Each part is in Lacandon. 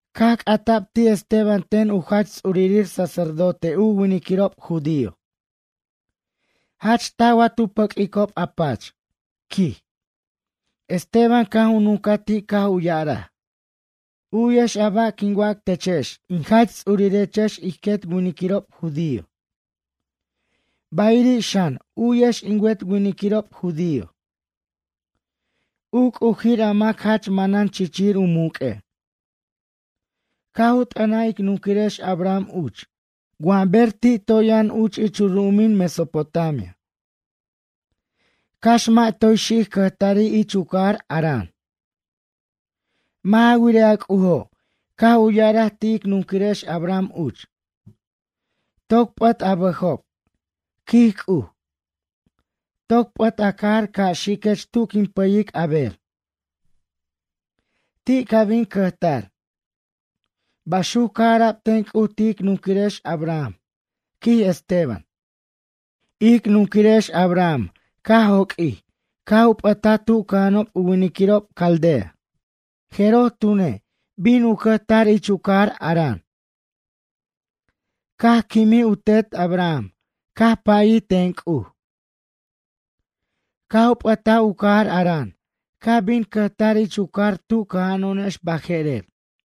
Caj c'ata'b ti' Esteban ten u jach ts'urir sacerdote u winiquirob judío: ―Jach taj wa tu pʌq'uicob a pach? ―quij. Esteban caj u nuncaj ti' caj u ya'araj: ―U'yex a ba' quin wac techex in jach ts'urirechex ij quet winiquirob judío, bayriri' xan, u'yex in wet winiquirob judío. U C'ujir, a mac jach manan chichir u muq'ue', caj u t'ʌnaj ic nunquirex Abraham uch, wa ber ti' toy yʌn uch ich u ru'umin Mesopotamia, cax mʌ' toy xic cʌjtari' ich u cajar Harán. Mʌ' ja wirej, a C'ujo' caj u ya'araj ti' ic nunquirex Abraham uch: “Toc p'ʌt a bʌjob ―quij C'uj. Toc p'ʌt a cajar ca' xiquech tu quin pʌyic a ber. Ti' ca bin cʌjtar.” Baxuc caj ara'b ten C'uj ti' ic nunquirex Abraham ―quij Esteban. Ic nunquirex Abraham caj joq'uij caj u p'ʌtaj tu cʌja'anob u winiquirob Caldea. Jeroj tune', bin u cʌjtar ich u cajar Harán. Caj quimij u tet Abraham, caj pʌyij ten C'uj, caj u p'ʌtaj u cajar Harán, caj bin cajʌr ich u cajar tu cʌjo'onex baje'rer.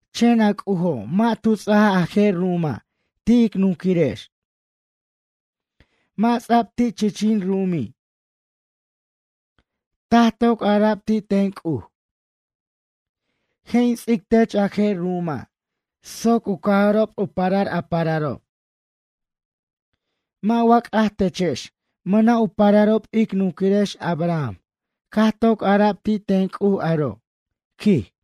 Chen a C'ujo' mʌ' ju ts'ajaj a je' ru'uma' ti' ic nunquirex, mʌ' ts'a'b ti' chichin ru'umi'. Taj toc ara'b ti' ten C'uj: “Je' in ts'ic tech a je' ru'uma' soc u cajʌrob u parar a pararob.” Mʌ' wa c'aj techex, mʌna' u pararob ic nunquirex Abraham caj toc ara'b ti' ten C'uj aro' ―quij.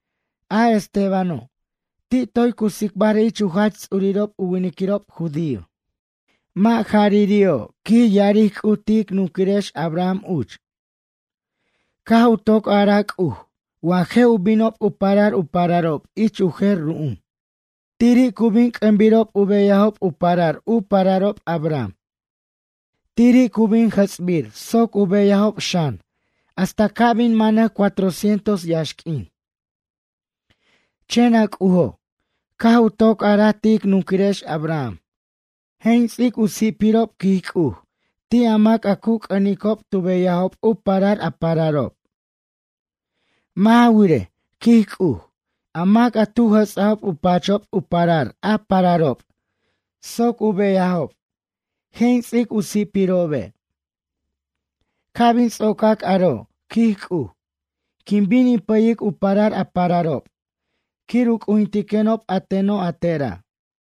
A Estebano', ti' toy cu tsicbar ich u jach ts'urirob u winiquirob judío: ―Mʌ' jarari'o', quij ya'aric C'uj ti' ic nunquirex Abraham uch. Caj u toc araj C'uj wa je' u binob u parar u pararob ich u jer ru'um. Tiri' cu bin c'ʌnbir beyajob u parar u pararob Abraham. Tiri' cu bin jʌts'bir soc u beyajob xan hasta ca' bin manʌc cuatrocientos yaxq'uin. Chen a C'ujo' caj u toc araj ti' ic nunquirex Abraham: “Je' in ts'ic u si'pirob, quij C'uj, ti' a mac a cu c'ʌnicob tu beyajob u parar a pararob. Mʌ' ja wirej, quij C'uj, a mac a tu jʌts'ajob u pachob u parar a pararob soc u beyajob, je' in ts'ic u si'pirobe'. Ca' bin ts'ocac aro', quij C'uj, quin bin in pʌyic u parar a pararob quir u c'ujintiquenob a teno' a tera'.”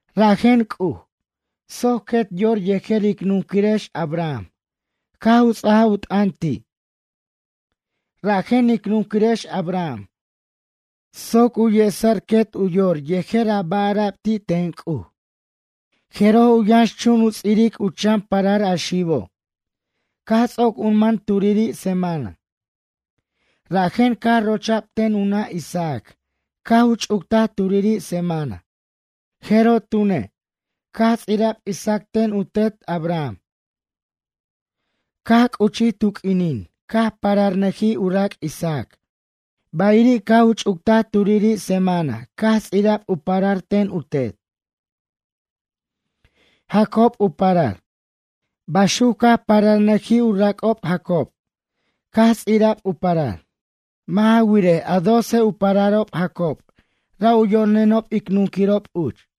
Rajen C'uj, soc quet u yor yejer ic nunquirex Abraham caj u ts'ajaj u t'ʌn ti', rajen ic nunquirex Abraham soc u yesa'r quet u yor yejer a ba' ara'b ti' ten C'uj, jeroj u yʌnxchun u ts'iric u chan parar a xibo', caj ts'oc u man turiri' semana. Rajen caj rocha'b ten u nʌ' Isaac caj u ch'uctaj turiri' semana, jeroj tune', caj ts'ira'b Isaac ten u tet Abraham. Caj c'uchij tu q'uinin caj pararnʌjij u rac' Isaac, bayiri' caj u ch'uctaj turiri' semana caj ts'ira'b u parar ten u tet. Jacob u parar. Baxuc caj pararnʌjij u rac'ob, Jacob caj ts'ira'b u parar. Mʌ' ja wirej, a doce u pararob Jacob ra' u yo'nenob ic nunquirob uch.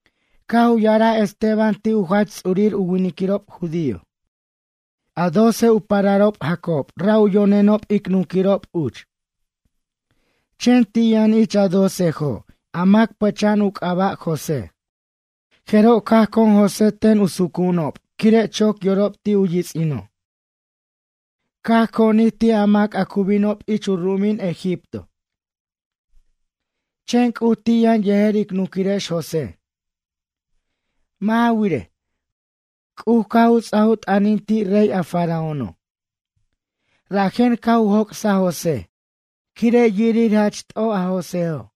Caj u ya'araj Esteban ti' u jach ts'urir u winiquirob judío: ―A doce u pararob Jacob, ra' u yo'nenob ic nunquirob uch. Chen ti' yʌn ich a docejo' a mac pʌch'a'an u c'aba' José. Jeroj caj con José ten u sucu'unob quire' choc yorob ti' u yits'ino'. Caj conij ti' a mac a cu binob ich u ru'umin Egipto. Chen C'uj ti' yʌn yejer ic nunquirex José. Mʌ' ja wirej, C'uj caj u ts'aj u t'ʌnin ti' rey, a Faraóno'. Rajen caj u joc'saj José quire' yirir jach t'oj a Joséjo'.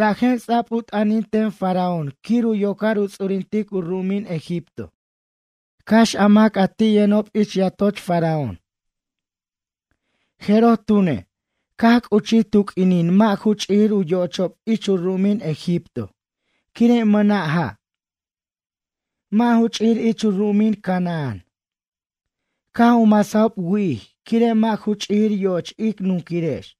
Rajen ts'a'b u t'ʌnin ten Faraón quir u yocar u ts'urintic u ru'umin Egipto. Cax a mac a ti' yʌnob ich yatoch Faraón. Jeroj tune', caj c'uchij tu q'uinin mʌ' ju ch'ijir u yo'ochob ich u ru'umin Egipto, quire' mʌna' ja'. Mʌ' ju ch'ijir ich u ru'umin Canaán. Caj u masajob wi'ij, quire' mʌ' ju ch'ijir yo'och ic nunquirex.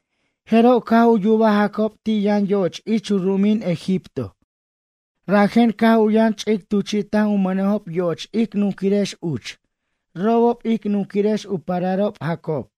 Jeroj caj u yubaj Jacob ti' yʌn yo'och ich u ru'umin Egipto, rajen caj u yʌn ch'ic tuchi'taj u mʌnejob yo'och ic nunquirex uch, robob ic nunquirex u pararob Jacob.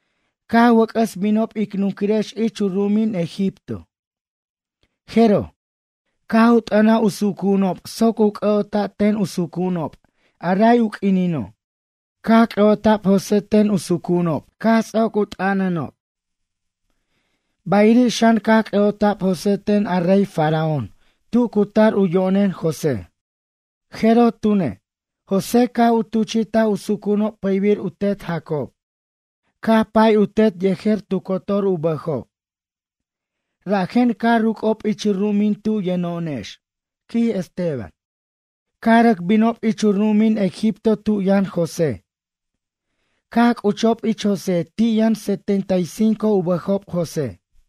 Caj wʌc'ʌs binob ic nunquirex ich u ru'umin Egipto, jeroj, caj u t'ʌnaj u sucu'unob soc u c'ʌ'ota' ten u sucu'unob, a ray u q'uinino', caj c'ʌ'ota'b José ten u sucu'unob, caj ts'oc u t'ʌnʌnob. Bayiri' xan, caj c'ʌ'ota'b José ten a rey Faraón tu cu tar u yo'nen José. Jeroj tune', José, caj u tuchi'taj u sucu'unob pʌybir u tet Jacob. Caj pay u tet yejer tu cotor u bʌjob. Rajen caj ruc'ob ich u ru'umin tu yʌno'onex ―quij Esteban―, caj rʌc binob ich u ru'umin Egipto tu yʌn José, caj c'uchob ich José ti' yʌn setenta y cinco u bʌjob José.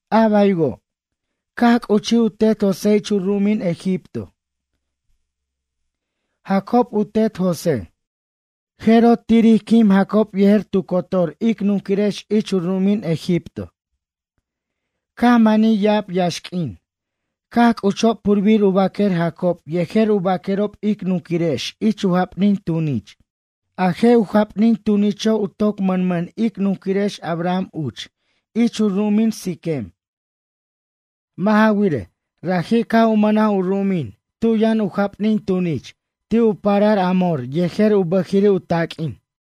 A baywo', caj c'uchij u tet José ich u ru'umin Egipto. Jacob u tet José. Jeroj tiri' quim Jacob yejer tu cotor ic nunquirex ich u ru'umin Egipto. Caj manij ya'ab yaxq'uin, caj cuchob purbir u baquer Jacob yejer u baquerob ic nunquirex ich u japnin tunich. A je' u japnin tunicho' u toc mʌnmʌn ic nunquirex Abraham uch ich u ru'umin Siquem. Mʌ' ja wirej, raji' caj u mʌnaj u ru'umin tu yʌn u japnin tunich ti' u parar Hamor yejer u bʌjiri' u taq'uin.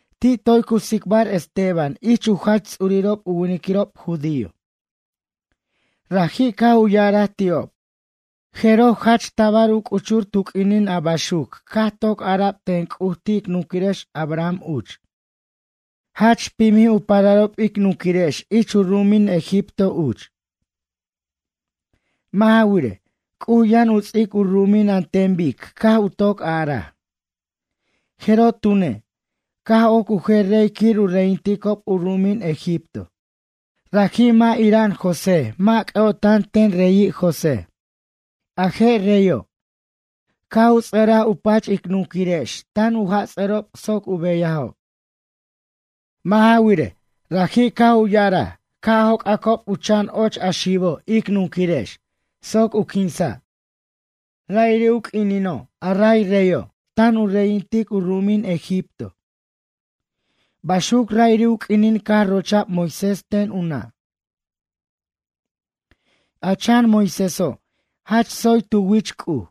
Ti' toy cu tsicbar Esteban ich u jach ts'urirob u winiquirob judío. Raji' caj u ya'araj ti'ob: ―Jeroj, jach tabar u c'uchur tu q'uinin a baxuc caj toc ara'b ten C'uj ti' ic nunquirex Abraham uch, jach pimij u pararob ic nunquirex ich u ru'umin Egipto uch. Mʌ' ja wirej, C'uj yʌn u ts'ic u ru'umin an ten bic caj u toc araj. Jeroj tune', caj oc u jer rey quir u reyinticob u ru'umin Egipto. Raji' mʌ' ira'an José, mʌ' c'ʌ'ota'an ten reyi' José. A je' reyo', caj u ts'ʌraj u pach ic nunquirex tan u jats'ʌrob soc u beyajob. Mʌ' ja wirej, raji' caj u ya'araj ca' joc'acob u chan och a xibo' ic nunquirex soc u quinsa'. Ra'iri' u q'uinino' a ray reyo', tan u reyinticob u ru'umin Egipto, baxuc ra'iri' u q'uinin caj rocha'b Moisés ten u nʌ'. A chan Moiséso' jach tsoy tu wich C'uj.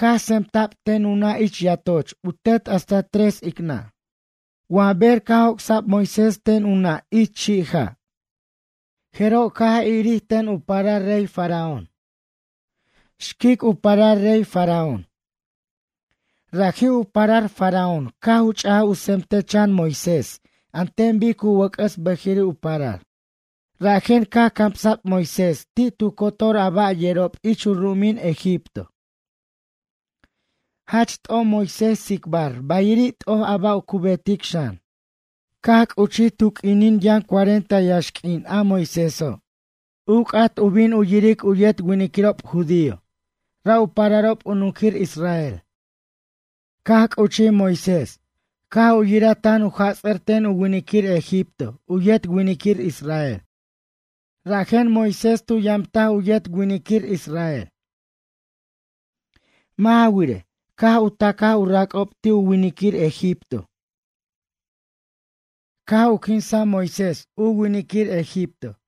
Caj tsemta'b ten u nʌ' ich yatoch u tet hasta tres ic nʌ'. Wa ber caj joc'sa'b Moisés ten u nʌ' ich chi' ja', jeroj caj irir ten u parar rey Faraón. Xquic u parar rey Faraón. Raji' u parar Faraón caj u ch'aj u tsemtej chan Moisés an ten bic u wʌc'ʌs bʌjiri' u parar. Rajen caj camsa'b Moisés ti' tu cotor ba' yerob ich u ru'umin Egipto. Jach t'oj Moisés tsicbar, bayiri' t'oj a ba' cu betic xan. ’Caj c'uchij tu q'uinin yʌn cuarenta yaxq'uin a Moiséso', u c'at u bin u yiric u yet winiquirob judío, ra' u pararob u nunquir israel. Caj c'uchij Moisés, caj u yiraj tan u jats'ʌr ten u winiquir egipto u yet winiquir israel, rajen Moisés tu yamtaj u yet winiquir israel. Mʌ' ja wirej, caj u tacaj u rac'ob ti' a winiquir egipto caj u quinsa Moisés u winiquir egipto.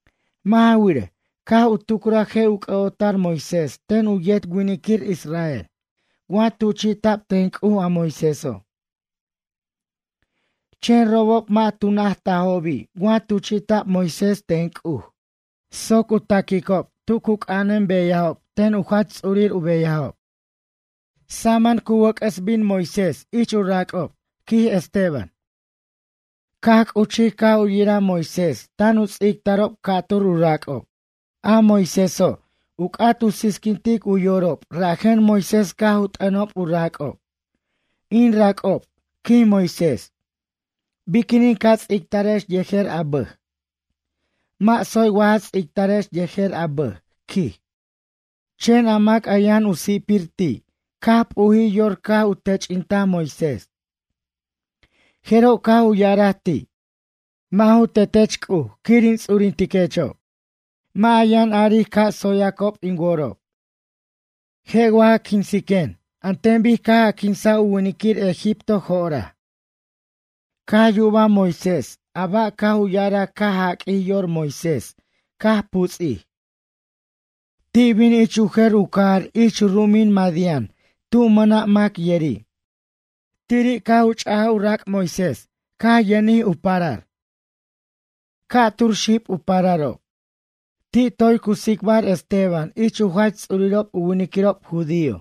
Mʌ' ja wirej, caj u tucraj je' u c'ʌ'ota'r Moisés ten u yet winiquir israel wa tuchi'ta'b ten C'uj a Moiséso'. Chen robob mʌ' tu najtajobi' wa tuchi'ta'b Moisés ten C'uj soc u taquicob tu cu c'anan beyajob ten u jach ts'urir u beyajob. Wʌc'ʌs bin Moisés saman ―quij Esteban―, ich u rac'ob. Caj c'uchij caj u yiraj Moisés tan u ts'ictarob ca'tur u rac'ob. A Moiséso', u c'at u sisquintic u yorob, rajen Moisés caj u t'ʌnob u rac'ob: “In rac'ob, quij Moisés, biquinin ca ts'ictarex yejer a bʌj? Mʌ' tsoy wa ja ts'ictarex yejer a bʌj”, quij. Chen a mac a yʌn u si'pir ti', caj p'ujij yor caj u tench'intaj Moisés. Jeroj caj u ya'araj ti': “Mʌ' ju tetech C'uj quir in ts'uritiquechob. Mʌ' a yʌn aric ca' tsoyac in worob. Je' wa ja quinsiquen an ten bic caj a quinsaj u winiquir egipto jo'oraj?” Caj yubaj Moisés a ba' caj u ya'araj caj jaq'uij yor Moisés caj puts'ij. Ti bin u cajar ich u jer u cajar ich u ru'umin Madián, tu' mʌna' mac yeri'. Tiri' caj u ch'aj u rac' Moisés caj yʌnjijo' u parar. Ca' tur xib u pararob. Ti' toy cu tsicbar Esteban ich u jach ts'urirob u winiquirob judío,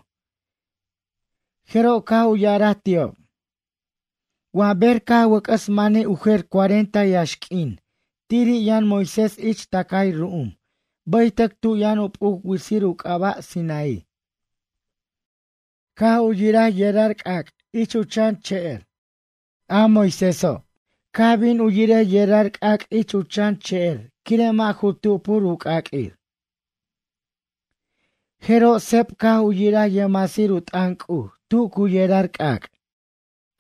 jeroj caj u ya'araj ti'ob: ―Wa ber caj wʌc'ʌs manij u jer cuarenta yaxq'uin, tiri' yʌn Moisés ich tʌcay ru'um baytʌc tu yʌn u p'uc witsir u c'aba' Sinaí. Caj u yiraj yerar c'ac' ich u chan che'er. A Moiséso' caj bin u yirej yerar c'ac' ich u chan che'er quire' mʌ' ju tupur u c'aq'uir. Jeroj seb, caj u yiraj yʌjmasir u t'ʌn C'uj tu cu yerar c'ac'.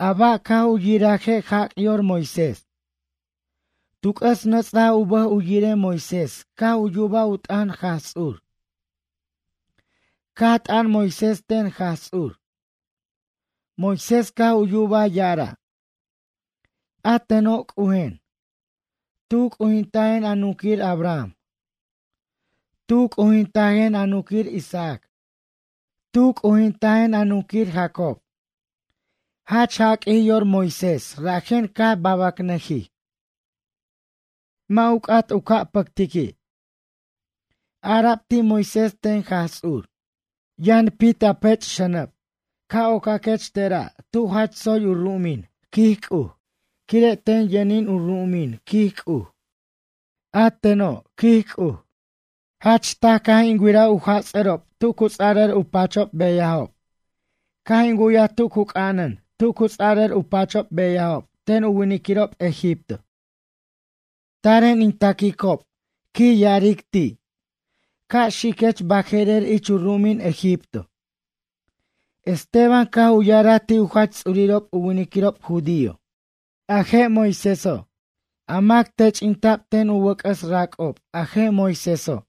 A ba' caj u yiraje' jac' yor Moisés. Tu c'ʌs nʌts'aj u bʌj u yirej Moisés caj u yubaj u t'ʌn Jaj Ts'ur. Caj t'ʌn Moisés ten Jaj Ts'ur. Moisés caj u yubaj ya'ara': “A teno' C'ujen. Tu c'ujintajen a nunquir Abraham. Tu c'ujintajen a nunquir Isaac. Tu c'ujintajen a nunquir Jacob.” Jach jaq'uij yor Moisés rajen caj babacnʌjij. Mʌ' u c'at u pʌctic biq'uini'. Ara'b ti' Moisés ten Jaj Ts'ur: “Yʌn pit a pech xʌnʌb ca' ocaquech tera' tu jach tsoy u ru'umin, quij C'uj, quire' ten yʌnin u ru'umin, quij C'uj. A teno', quij C'uj, jach taj caj in wiraj u jats'ʌrob tu cu ts'arʌr u pachob beyajob. Caj in wu'yaj tu cu c'anan tu cu ts'ara'r u pachob u beyajob ten u winiquirob egipto. Taren in taquicob, quij ya'aric ti', ca' xiquech baje'rer ich u ru'umin Egipto.” Esteban caj u ya'araj ti' u jach ts'urirob u winiquirob judío: ―A je' Moiséso', a mac tench'inta'b ten u wʌc'ʌs rac'ob, a je' Moiséso',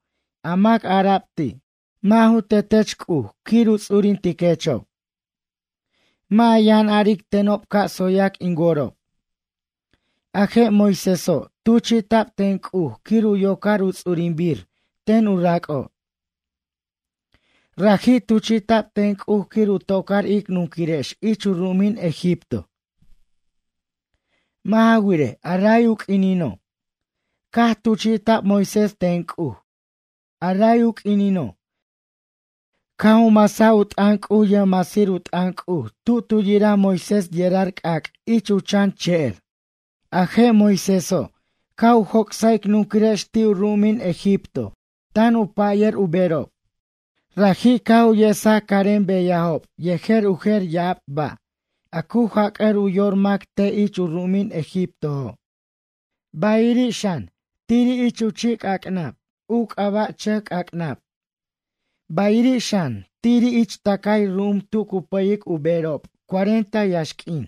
a mac ara'b ti': “Mʌ' ju tetech C'uj quir in ts'urintiquechob'. Mʌ' a yʌn aric tenob ca' tsoyac in worob.” A je' Moiséso' tuchi'ta'b ten C'uj quir u yocar u ts'urinbir ten u rac'ob. Raji' tuchi'ta'b ten C'uj quir u tocar ic nunquirex ich u ru'umin Egipto. Mʌ' ja wirej, a ray u q'uinino', caj tuchi'ta'b Moisés ten C'uj, a ray u q'uinino', caj u masaj u t'ʌn C'uj yʌjmasir u t'ʌn C'uj tu tu yiraj Moiséso' yerar c'ac' ich u chan che'er. A je' Moiséso' caj u joc'saj ic nunquirex ti' u ru'umin Egipto tan u pʌyir u berob. Raji' caj u yesaj carem beyajob yejer u jer ya'ab ba' a cu jac'ʌr u yor mac te' ich u ru'umin a Egiptojo', bayiri' xan, tiri' ich u chi' c'ac'nab u c'aba' Chʌc C'ac'nab bayiri' xan, tiri' ich tʌcay ru'um tu cu pʌyic u berob cuarenta yaxq'uin.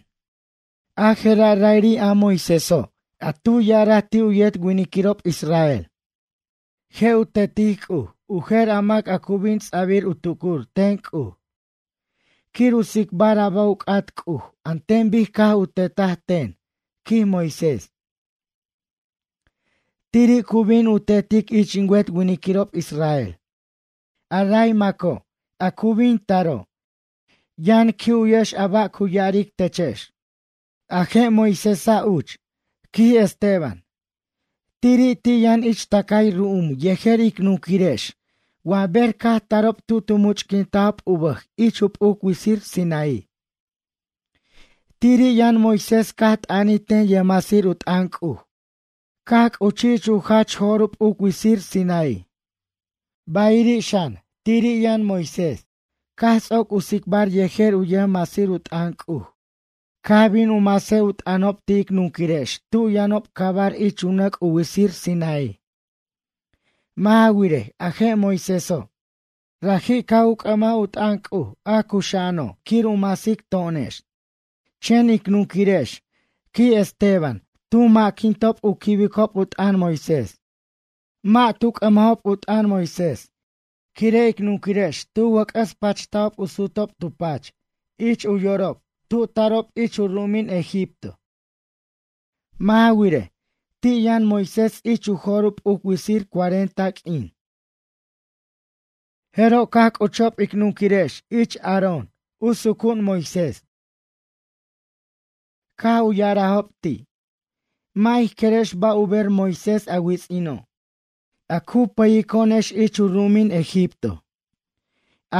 A je'ra' ra'iri' a Moiséso' a tu ya'araj ti' u yet winiquirob israel: “Je' u tetic C'uj u jer a mac a cu bin ts'a'bir u tucur ten C'uj quir u tsicbar a ba' u c'at C'uj an ten bic caj tu tetaj ten, quij Moisés. Tiri' cu bin u tetic ich in wet winiquirob israel. A ray maco', a cu bin taro' yʌn qui' u'wiquex a ba' cu ya'aric techex.” A je' Moisésa' uch ―quij Esteban―. Tiri' ti' yʌn ich tʌcay ru'um yejer ic nunquirex wa ber caj tarob tu tu much'quintajob u bʌj ich u p'uc witsir Sinaí. Tiri' yʌn Moisés caj t'ʌnij ten yʌjmasir u t'ʌn C'uj caj c'uchij ich u jach jo'r u p'uc witsir Sinaí. Bayiri' xan, tiri' yʌn Moisés, caj ts'oc u tsicbar yejer u yʌjmasir u t'ʌn C'uj, caj bin u masej u t'ʌnob ti' ic nunquirex tu yʌnob cabar ich u nʌc' u witsir Sinaí. Mʌ' ja wirej, a je' Moiséso', raji' caj u c'ʌmaj u t'ʌn C'uj, a cuxa'ano', quir u masic to'onex. ’Chen ic nunquirex ―quij Esteban―, tu mʌ'quintob u quibicob u t'an Moisés. Mʌ' tu c'ʌmajob u t'ʌn Moisés, quire' ic nunquirex tu wʌc'ʌs pachtajob u sutob tu pach ich u yorob tu tarob ich u ru'umin Egipto. Mʌ' ja wirej, ti' yʌn Moisés ich u jo'r u p'uc witsir cuarenta q'uin, jeroj caj c'uchob ic nunquirex ich u sucu'un Moisés, Aarón. Caj u ya'arajob ti': “Mʌ' ij querex ba' u ber Moisés a wits'ino', a cu pʌyico'onex ich u ru'umin Egipto.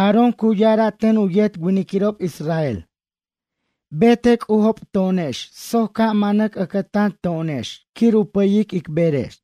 Aarón cu ya'ara' ten u yet winiquirob israel: Betej c'ujob to'onex soc ca' manʌc ʌcʌtan to'onex quir u pʌyic ic berex.”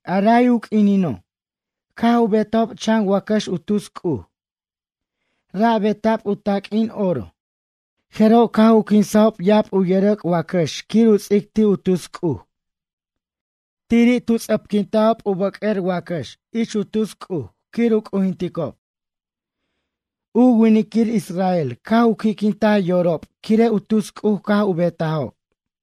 A ray u q'uinino', caj u betajob chan wacʌx u tus c'uj. Ra' beta'b u taq'uin oro. Jeroj caj u quinsajob ya'ab u yʌrʌc' wacʌx quir u ts'ic ti' u tus c'uj. Tiri' tu ts'ʌpquintajob u bʌq'uer wacʌx ich u tus c'uj quir u c'ujinticob. U winiquir israel caj u qui'quintaj yorob quire' u tus c'uj caj u betajob.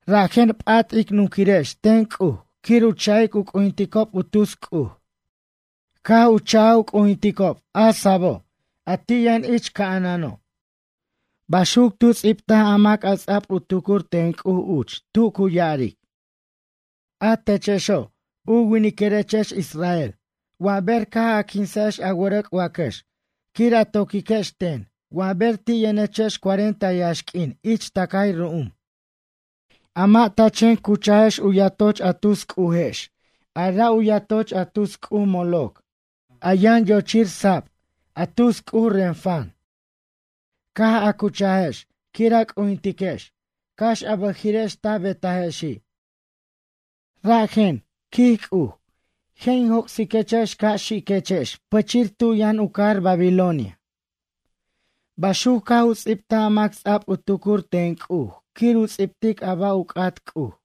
Rajen p'at ic nunquirex ten C'uj quir u cha'ic u c'ujinticob u tus c'uj, caj u cha'aj u c'ujinticob, a sabo' a ti' yʌn ich ca'anano'. Baxuc tu ts'ibtaj a mac a ts'a'b u tucur ten C'uj uch tu cu ya'aric: A techexo', u winiquirechex israel wa ber caj a quinsajex a wʌrʌc' wacʌx quir a toquiquex ten wa ber ti' yʌnechex cuarenta yaxq'uin ich tʌcay ru'um? A mʌ' ta chen cuchajex u yatoch a tus c'ujex, a ra' u yatoch a tus c'uj Moloc, a yʌn yochir sab, a tus c'uj Renfán caj a cuchajex quir a c'ujintiquex cax a bʌjiri'ex ta betajexi'. Rajen, quij C'uj, je' in joc'siquechex ca' xiquechex pichir tu yʌn u cajar Babilonia. Baxuc caj u ts'ibtaj a mac ts'a'b u tucur ten C'uj quir u ts'ibtic a ba' u c'at C'uj.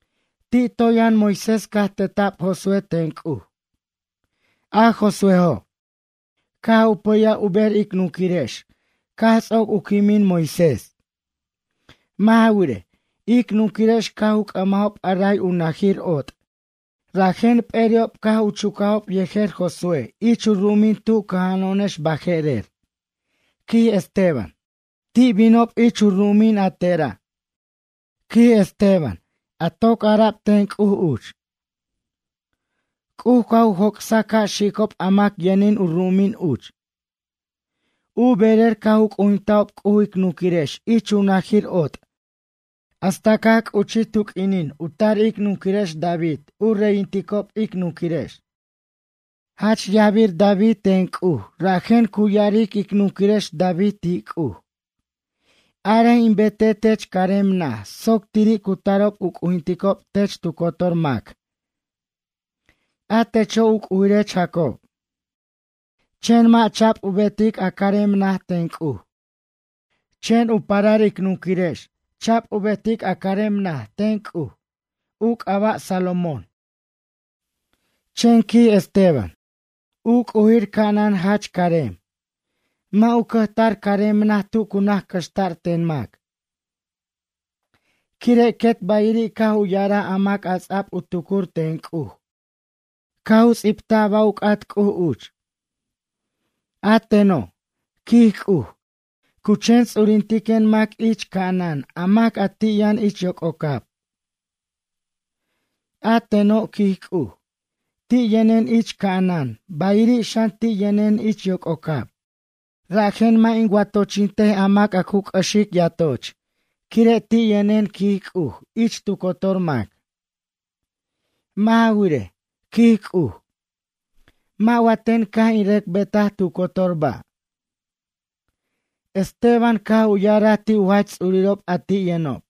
Ti' toy yʌn Moisés caj teta'b Josué ten C'uj. A Josuéjo', caj u pʌyaj u ber ic nunquirex caj ts'oc u quimin Moisés. Mʌ' ja wirej, ic nunquirex caj u c'ʌmajob a ray u najir ot', rajen p'eri'ob caj u cuchajob yejer Josué ich u ru'umin tu cʌja'ano'onex baje'rer ―quij Esteban―. Ti' binob ich u ru'umin a tera' ―quij Esteban―, a toc ara'b ten C'uj uch. C'uj caj u joc'saj ca' xicob a mac yʌnin u ru'umin uch. U berer caj u c'ujintajob C'uj ic nunquirex ich u najir ot' hasta caj c'uchij tu q'uinin u tar ic nunquirex David u reyinticob ic nunquirex. Jach yajbir David ten C'uj rajen cu ya'aric ic nunquirex David ti' C'uj: “Arej in betej tech carem naj soc tiri' cu tarob u c'ujinticob tech tu cotor mac, a techo', u c'ujirech Jacob.” Chen mʌ' cha'b u betic a carem najo' ten C'uj. Chen u parar ic nunquirex cha'b u betic a carem najo' ten C'uj. U c'aba' Salomón. Chen ―quij Esteban―, U c'ujir ca'anan jach carem. Mʌ' u cʌjtar ich carem naj tu cu c'axʌr ten mac, quire' quet bayiri' caj u ya'araj a mac a ts'a'b u tucur ten C'uj caj u ts'ibtaj a ba' u c'at C'uj uch: A teno', quij C'uj, cu chen ts'urintiquen mac ich ca'anan a mac, a ti' yʌn ich yoc'ocab. A teno', quij C'uj, ti' yʌnen ich ca'anan, bayiri' xan, ti' yʌnen ich yoc'ocab. Rajen mʌ' in watochintej a mac a cu c'ʌxic yatoch, quire' ti' yʌnen, quij C'uj, ich tu cotor mac. Mʌ' ja wirej, quij C'uj, mʌ' wa ten caj in rʌc betaj tu cotor ba'? Esteban caj u ya'araj ti' u jach ts'urirob a ti' yʌnob: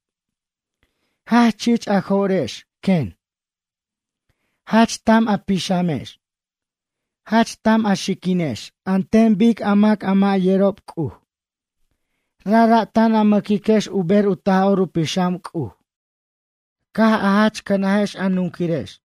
―Jach chich a jo'rex, quen. Jach tam a pixamex. Jach tam a xiquinex, an ten bic a mac a mʌ' yerob C'uj. Rajra' tan a mʌquiquex u ber u Taj'or u Pixam C'uj, caj a jach cʌnajex a nunquirex.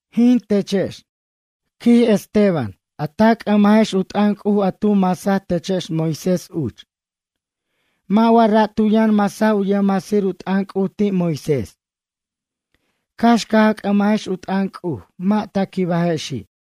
Jin, techex ―quij Esteban―, a ta c'ʌmajex u t'ʌn C'uj a tu masaj techex Moisés uch. Mʌ' wa ra' tu yʌn masaj u yʌjmasir u t'ʌn C'uj ti' Moisés. Cax caj a c'ʌmajex u t'ʌn C'uj, mʌ' ta quibajexi'.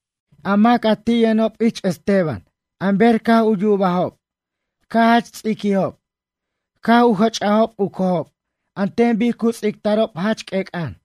A mac a ti' yʌnob ich Esteban an ber caj u yubajob caj jach ts'iquijob. Caj u jʌts'ajob u cojob an ten bic cu ts'ictarob jach q'uec'ʌn.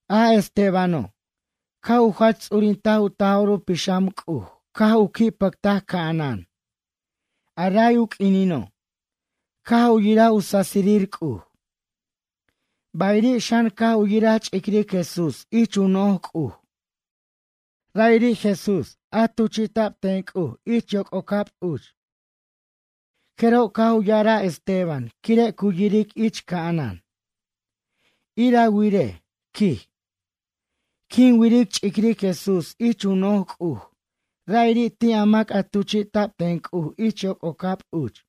A Estebano', caj u jach ts'urintaj u Taj'or u Pixam C'uj, caj u qui' pʌctaj ca'anan, a ray u q'uinino', caj u yiraj u sasirir C'uj. Bayiri' xan, caj u yiraj ch'iric Jesús ich u no'j C'uj, ra'iri' Jesús a tuchi'ta'b ten C'uj ich yoc'ocab uch. Jeroj caj u ya'araj Esteban quire' cu yiric ich ca'anan: ―Ir a wirej ―quij―. Quin wiric ch'iric Jesús ich u no'j C'uj, ra'iri' ti' a mac a tuchi'ta'b ten C'uj ich yoc'ocab uch.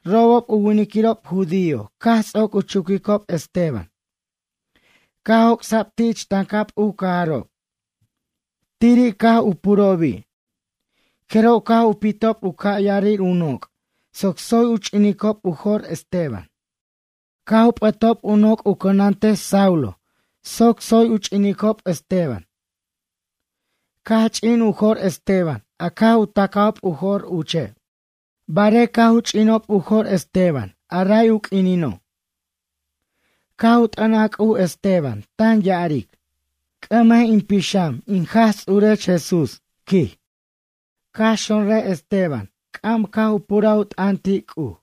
Robob u winiquirob judío, caj ts'oc u chuquicob Esteban, caj joc'sa'b ti' ich tancab u cajarob. Tiri' caj u purobi'. Jeroj caj u pitob u ca' ya'arir u noc' soc tsoy u ch'inicob u jo'r Esteban. Caj u p'ʌtob u noc'ob u cʌnantej Saulo, soc tsoy u ch'inicob Esteban. Caj ch'in u jo'r Esteban a caj u tacajob u jo'r uche'. Barej caj u ch'inob u jo'r Esteban a ray u q'uinino', caj u t'ʌnaj C'uj Esteban, tan ya'aric: ―C'ʌmej in pixam, in Jaj Ts'urech Jesús ―quij. Caj xonrʌj Esteban c'am cu puraj u t'ʌn ti' C'uj: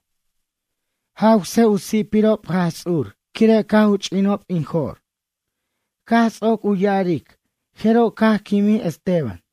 ―Jawsej u si'pirob Jaj Ts'ur, quire' caj u ch'inob in jo'r. Caj ts'oc u ya'aric, jeroj caj quimij Esteban.